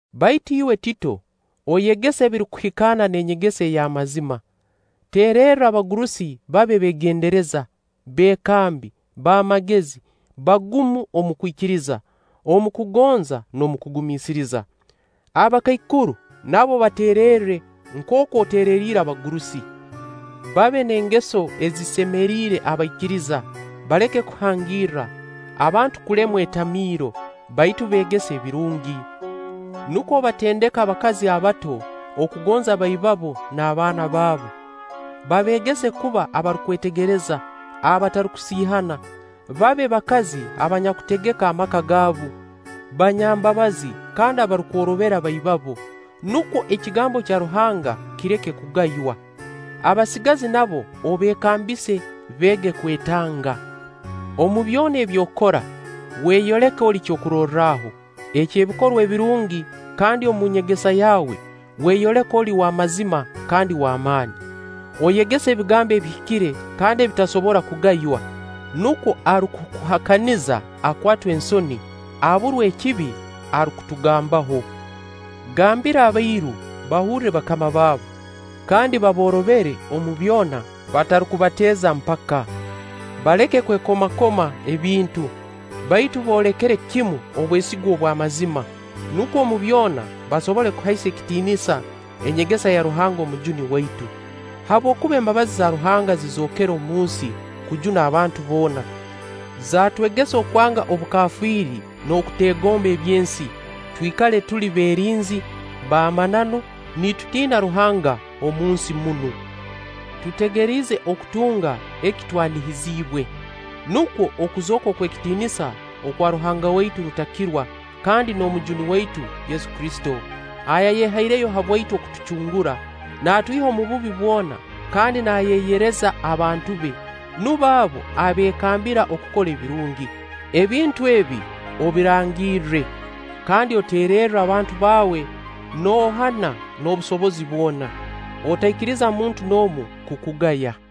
Baitu iwe Tito, oyegese ebirukuhikaana n'enyegesa ey'amazima. Teererra abagurusi babe beegendereza, beekambi, b'amagezi, bagumu omu kwikiriza, omu kugonza n'omu kugumiisiriza. Abakaikuru, nabo bateererre nkooku otereriire abagurusi. Babe n'engeso ezisemeriire abaikiriza, baleke kuhangirra, abantu kulemwa etamiiro; baitu beegese ebirungi, nukwo batendeke abakazi abato okugonza baibabo n'abaana baabu. Babeegese kuba abarukwetegereza, abatarukusiihana, babe bakazi abanyakutegeka amaka gaabu, banyambabazi kandi abarukworobera baibabo, nukwo ekigambo kya Ruhanga kireke kugaywa. Abasigazi nabo obeekambise, beege kwetanga. Omu byona ebi okora, weyoleke oli kyokurorraho, eky'ebikorwa ebirungi, kandi omu nyegesa yaawe weyoleke oli w'amazima kandi w'amaani. Oyegese ebigambo ebihikire kandi ebitasobora kugaywa, nukwo arukukuhakaniza akwatwe ensoni, aburwe ekibi eki arukutugambaho. Gambira abairu bahurre bakama baabu, kandi baboorobere omu byona, batarukubateeza mpaka. Baleke kwekomakoma ebintu, baitu boolekere kimu obwesigwa obw'amazima, nukwo omu byona basobole kuhaisa ekitiinisa enyegesa ya Ruhanga Omujuni waitu. Habwokuba embabazi za Ruhanga zizookere omu nsi kujuna abantu boona, zaatwegesa okwanga obukafiiri n'okuteegomba eby'ensi, twikale tuli beerinzi, b'amananu, nitutiina Ruhanga omu nsi munu, tutegeriize okutunga eki twanihizibwe. Nukwo okuzooka okw'ekitiinisa okwa Ruhanga waitu Rutakirwa kandi n'Omujuni waitu Yesu Kristo, ayayehaireyo habwaitu okutucungura, naatwiha omu bubi bwona kandi naayeyereza abantu be, nubo abo abeekambira okukora ebirungi. Ebintu ebi, obirangirre. Kandi oteererre abantu baawe noohana n'obusobozi bwona. Otaikiriza muntu n'omu kukugaya.